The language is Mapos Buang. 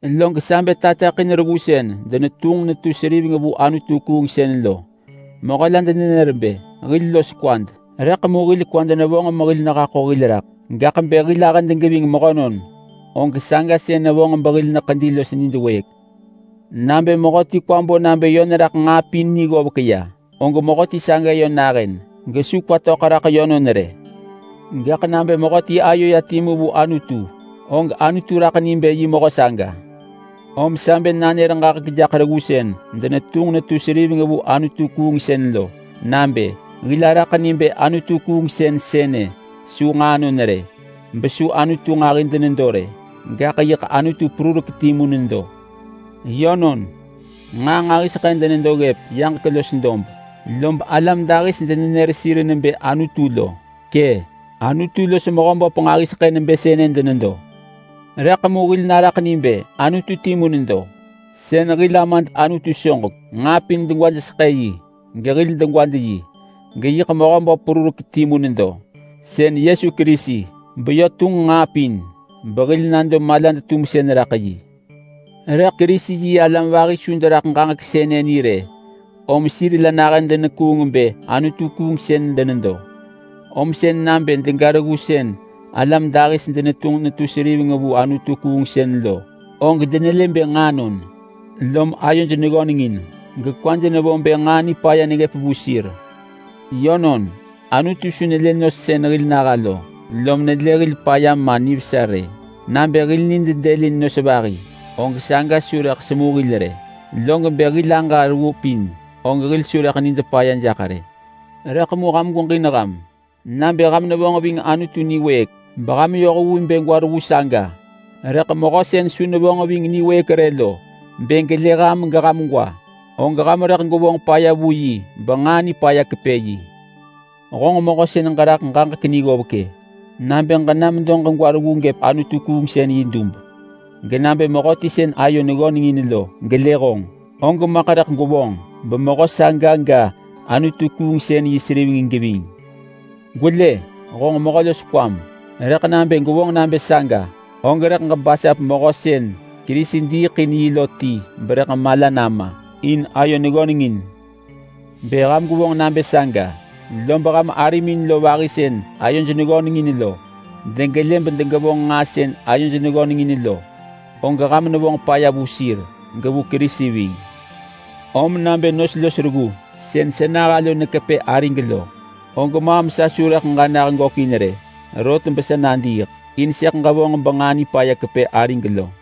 Log ham loḳ tepëḳ in reggu sën denetunġ netu seriveng vu anutu-kuungsën lo loḳ ham ḳapiya. Yönon, “Hil los kwad!” rëḳ mu hil kwad nevonġ mehil nehaḳo hil raḳ, gaḳ bë hil ahëd geving mehönon og saga sën nevonġ behil neḳedi los nid wëëk. Nabë mehöti kwa bo nabë yö neraḳ nġaa pin ni ggovek ya, og mehöti saga yö nahën gesu kwa töḳ raḳ yönon rë. Gaḳ nabë mehöti ayo ya timu vu Anutu, og Anutu raḳ ni bë yi mehö saga. Om sa bë nanër ġaġek jaḳ reggu sën denetunġ netu seriveng vu anutu-kuungsën lo nabë: Hil araḳ ni bë anutu-kuungsën sënë su nġaanon rë. Besu anutu nġahi denedo rë, gaḳ yiḳ Anutu perurek timu nedo. Yönon, nġaa nġahiseḳë denedo ggëp yaġek los dob, lob alam dahis denenër sir nebë anutu lo. Kë’, anutu los mehöböp nġahiseḳë nebë sënë denedo, rëḳ mu hil naraḳ ni bë Anutu timu nedo, sën hil Amad Anutu soġek. Nġaa pin degwajseḳë yi, gehil degwad yi. Geyiḳ Mehöböp perurek timu nedo, sën Yesu Kerisi, beyö tunġ nġaa pin. Behil nado malad-tumsën raḳ yi. Rëḳ Kerisi-yi-alam vahi su deraḳ ġaġek sënë ni rë, om sir la nahën denekuung bë anutu-kuungsën denedo. Om sën nabë dega reggu sën alam dahis denetunġ netu seriveng vu anutu-kuungsën lo, og denelë bë nġaanon, lom ayoj neggönengin gekwaj nevo bë nġaa nipaya neggëp vu sir. Yönon, Anutu su nelë nos sën hil naha lo lom nelë hil paya ma nivesa rë. Nabë hil nid dëlin nos vahi, og saga su rëḳ semu hil rë. Log bë hil aġa reggu pin, og hil su rëḳ nid paya jaḳ rë. Rëḳ mu ham gweġin ham. Nabë ham nevonġ ving Anutu niwëëk beham yoh vu bë gwa reggu saga, rëḳ mehö sën su nevonġ ving niwëëk rë lo bë gelë ham geham gwa, og ham rëḳ gwevonġ paya vu yi benġaa nipaya rëḳ kepë yi. Honġ mehö sën ġeraḳ ġaġek ni ggovek-e! Nabë ġena medo ġegwa reggu gëp anutu-kuungsën yi dub, genabë mehöti sën ayo neggönengin lo gelë honġ, og maḳ rëḳ gwevonġ bemehö saga ga anutu-kuungsën yi seriveng geving. Gwelë! Honġ mehö los kwam, rëḳ nabë gwevonġ nabë saga, og rëḳ ġebasap mehö sën Kerisi diiḳ in yi lo ti berëḳ mala nama in ayo neggönengin. Bë ham gwevonġ nabë saga, lob ham arimin lo vahi sën ayoj neggönengin lo degelë bedegevonġ nġaa sën ayoj neggönengin lo, og ham nevonġ paya vu sir gevu Kerisi ving. Om nabë nos los reggu sën sa naha lo nekepë arig lo, og maam sa su rëḳ aġa nah gökin rë rot besa nadiiḳ, in sëḳ ġevonġ benġaa nipaya kepë arig lo.